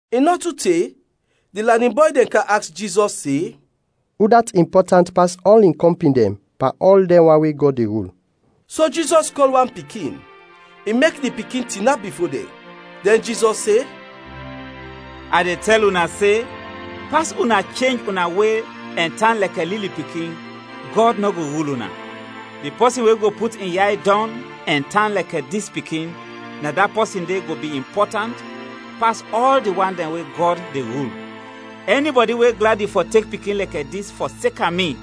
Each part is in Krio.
I nɔ tu te, di lanin bɔy dɛn kam aks Jizɔs se, “Udat impɔtant pas ɔl in kɔmpin dɛn pan ɔl dɛn wan we Gɔd de rul?” So Jizɔs kɔl wan pikin, i mek di pikin tinap bifo dɛn; dɛn Jizɔs se, “A de tɛl una se, pas una chenj una we ɛn tan lɛkɛ lili pikin, Gɔd nɔ go rul una. Di pɔsin we go put in yay dɔng ɛn tan lɛkɛ dis pikin, na da pɔsin de go bi impɔtant pas ɔl di wan dɛn we Gɔd de rul. Ɛnibɔdi we gladi fɔ tek pikin lɛkɛ dis, fɔseka mi,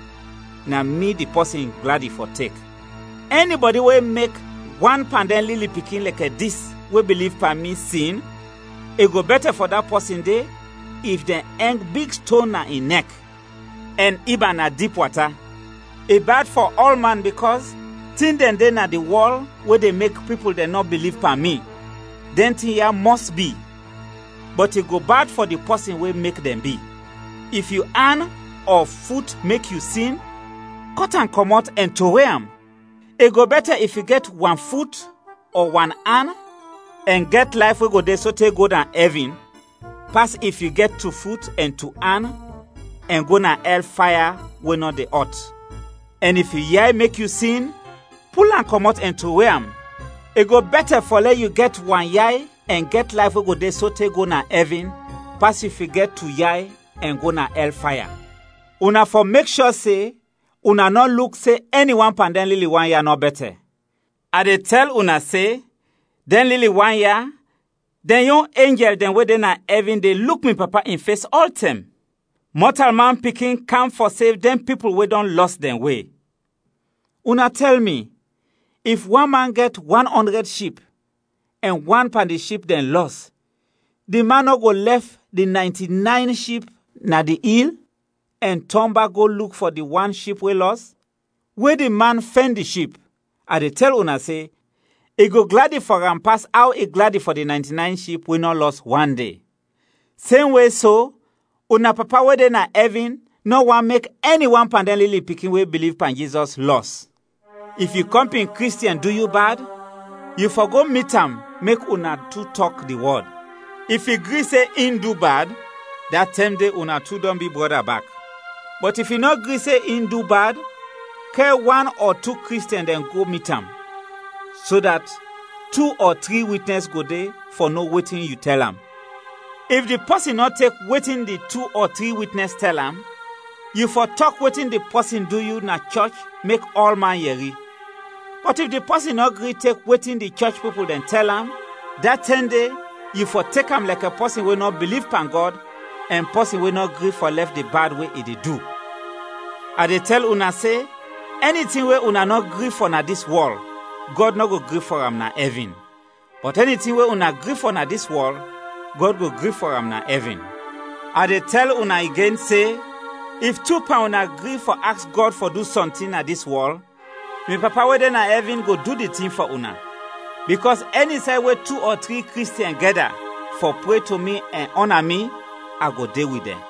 na mi di pɔsin gladi fɔ tek. “Ɛnibɔdi we mek wan pan dɛn lili pikin lɛkɛ dis we biliv pan mi, sin, i go bɛtɛ fɔ da pɔsin de if dɛn ɛng big ston na in nɛk, ɛn ib am na dip wata. I bad fɔ ɔlman bikɔs tin dɛn de na di wɔl we de mek pipul dɛn nɔ biliv pan mi. Dɛn tin ya mɔs bi, bɔt i go bad fɔ di pɔsin we mek dɛn bi. “If yu an ɔ fut mek yu sin, kɔt am kɔmɔt ɛn trowe am. I go bɛtɛ if yu gɛt wan fut ɔ wan an ɛn gɛt layf we go de sote go na ɛvin, pas if yu gɛt tu fut ɛn tu an ɛn go na ɛl faya we nɔ de ɔt. Ɛn if yu yay mek yu sin, pul am kɔmɔt ɛn trowe am. I go bɛtɛ fɔ lɛ yu gɛt wan yay ɛn gɛt layf we go de sote go na ɛvin, pas if yu gɛt tu yay ɛn go na ɛl faya. “Una fɔ mek shɔ se una nɔ luk se ɛni wan pan dɛn lili wan ya nɔ bɛtɛ. A de tɛl una se, dɛn lili wan ya, dɛn yon enjɛl dɛn we de na ɛvin de luk mi Papa in fes ɔltɛm! [ Mɔtalman Pikin kam fɔ sev dɛn pipul we dɔn lɔs dɛn we.] “Una tɛl mi, if wan man gɛt wan ɔndrɛd ship, ɛn wan pan di ship dɛn lɔs, di man nɔ go lɛf di naynti-nayn ship na di il, ɛn tɔn bak go luk fɔ di wan ship we lɔs? We di man fɛn di ship, a de tɛl una se, i go gladi fɔ am pas aw i gladi fɔ di naynti-nayn ship we nɔ lɔs wande. Semwe so, una Papa we de na ɛvin nɔ want mek ɛni wan pan dɛn lili pikin we biliv pan Jizɔs, lɔs. “If yu kɔmpin Kristiɛn du yu bad, yu fɔ go mit am mek una tu tɔk di wɔd. If i gri se in du bad, da tɛm de una tu dɔn bi brɔda bak. Bɔt if i nɔ gri se in du bad, kɛr wan ɔ tu Kristiɛn dɛn go mit am, so dat tu ɔ tri witnɛs go de fɔ no wetin yu tɛl am. If di pɔsin nɔ tek wetin di tu ɔ tri witnɛs tɛl am, yu fɔ tɔk wetin di pɔsin du yu na di chɔch mek ɔlman yɛri. Bɔt if di pɔsin nɔ gri tek wetin di chɔch pipul dɛn tɛl am, da tɛm de yu fɔ tek am lɛkɛ pɔsin we nɔ biliv pan Gɔd ɛn pɔsin we nɔ gri fɔ lɛf di bad we i de du. “A de tɛl una se, ɛni tin we una nɔ gri fɔ na dis wɔl, Gɔd nɔ go gri fɔ am na ɛvin, bɔt ɛni tin we una gri fɔ na dis wɔl, Gɔd go gri fɔ am na ɛvin. “A de tɛl una igen se, if tu pan una gri fɔ aks Gɔd fɔ du sɔntin na dis wɔl, mi Papa we de na ɛvin go du di tin fɔ una. Bikɔs ɛni say we tu ɔ tri Kristiɛn gɛda fɔ pre to mi ɛn ɔna mi, a go de wit dɛn.”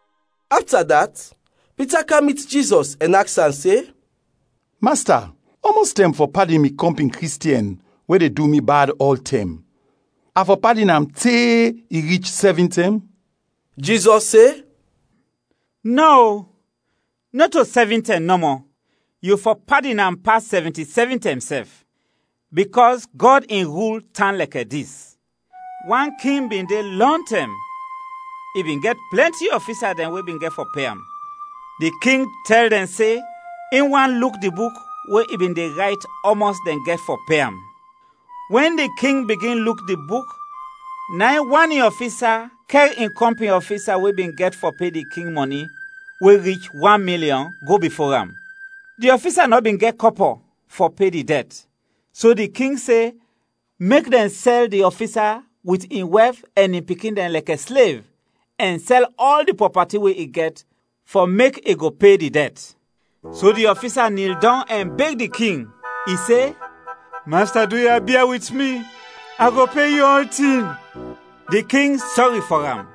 Afta dat, Pita kam mit Jizɔs ɛn aks am se, “Masta, ɔmɔs tɛm a fɔ padin mi kɔmpin Kristiɛn we de du mi bad ɔltɛm? A fɔ padin am te i rich sɛvin tɛm?” Jizɔs se, “Nɔ, o, nɔto sɛvin tɛm nɔmɔ, yu fɔ padin am pas sɛvinti-sɛvin tɛm sɛf. Bikɔs Gɔd in rul tan lɛkɛ dis: Wan king bin de lɔntɛm; i bin gɛt plɛnti ɔfisa dɛn we bin gɛt fɔ pe am. Di king tɛl dɛn se in wan luk di buk we i bin de rayt ɔmɔs dɛn gɛt fɔ pe am. Wɛn di king bigin luk di buk, na in, wan in ɔfisa kɛr in kɔmpin ɔfisa we bin gɛt fɔ pe di king mɔni we rich wan milyɔn, go bifo am. Di ɔfisa nɔ bin gɛt kɔpɔ fɔ pe di dɛt, so di king se mek dɛn sɛl di ɔfisa wit in wɛf ɛn in pikin dɛn lɛkɛ slev, ɛn sɛl ɔl di prɔpati we i gɛt, fɔ mek i go pe di dɛt. So di ɔfisa nil dɔng ɛn beg di king. I se, ‘Masta, duya, bia wit mi, a go pe yu ɔltin.’ Di king sɔri fɔ am,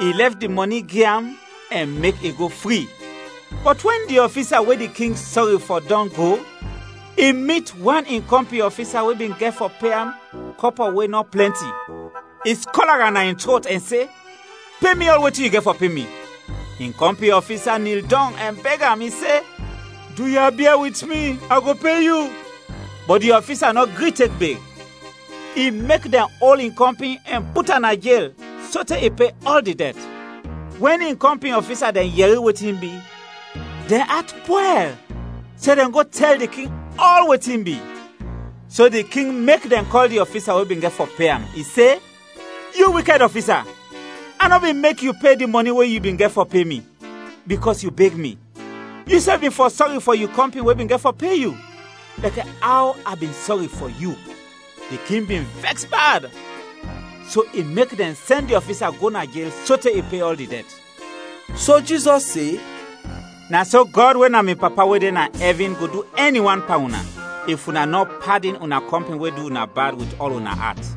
i lɛf di mɔni gi am ɛn mek i go fri. “Bɔt wɛn di ɔfisa we di king sɔri fɔ dɔn go, i mit wan in kɔmpin ɔfisa we bin gɛt fɔ pe am kɔpɔ we nɔ plɛnti. I skɔla am na in trot ɛn se, ‘Pe mi ɔl wetin yu gɛt fɔ pe mi!’ In kɔmpin ɔfisa nil dɔng ɛn beg am, i se, ‘Duya, bia wit mi, a go pe yu.’ Bɔt di ɔfisa nɔ gri tek beg, i mek dɛn ol in kɔmpin ɛn put am na jel sote i pe ɔl di dɛt. Wɛn in kɔmpin ɔfisa dɛn yɛri wetin bi, dɛn at pwɛl, so dɛn go tɛl di king ɔl wetin bi. So di king mek dɛn kɔl di ɔfisa we bin gɛt fɔ pe am, i se, ‘Yu wikɛd ɔfisa! A nɔ bin mek yu pe di mɔni we yu bin gɛt fɔ pe mi, bikɔs yu beg mi. Yusɛf bin fɔ sɔri fɔ yu kɔmpin we bin gɛt fɔ pe yu, lɛkɛ aw a bin sɔri fɔ yu.’ Di king bin vɛks bad, so i mek dɛn sɛn di ɔfisa go jel sote i pe ɔl di dɛt.” So Jizɔs se, “Na so Gɔd we na mi Papa we de na ɛvin go du ɛni wan pan una, if una nɔ padin una kɔmpin we du una bad, wit ɔl una at.”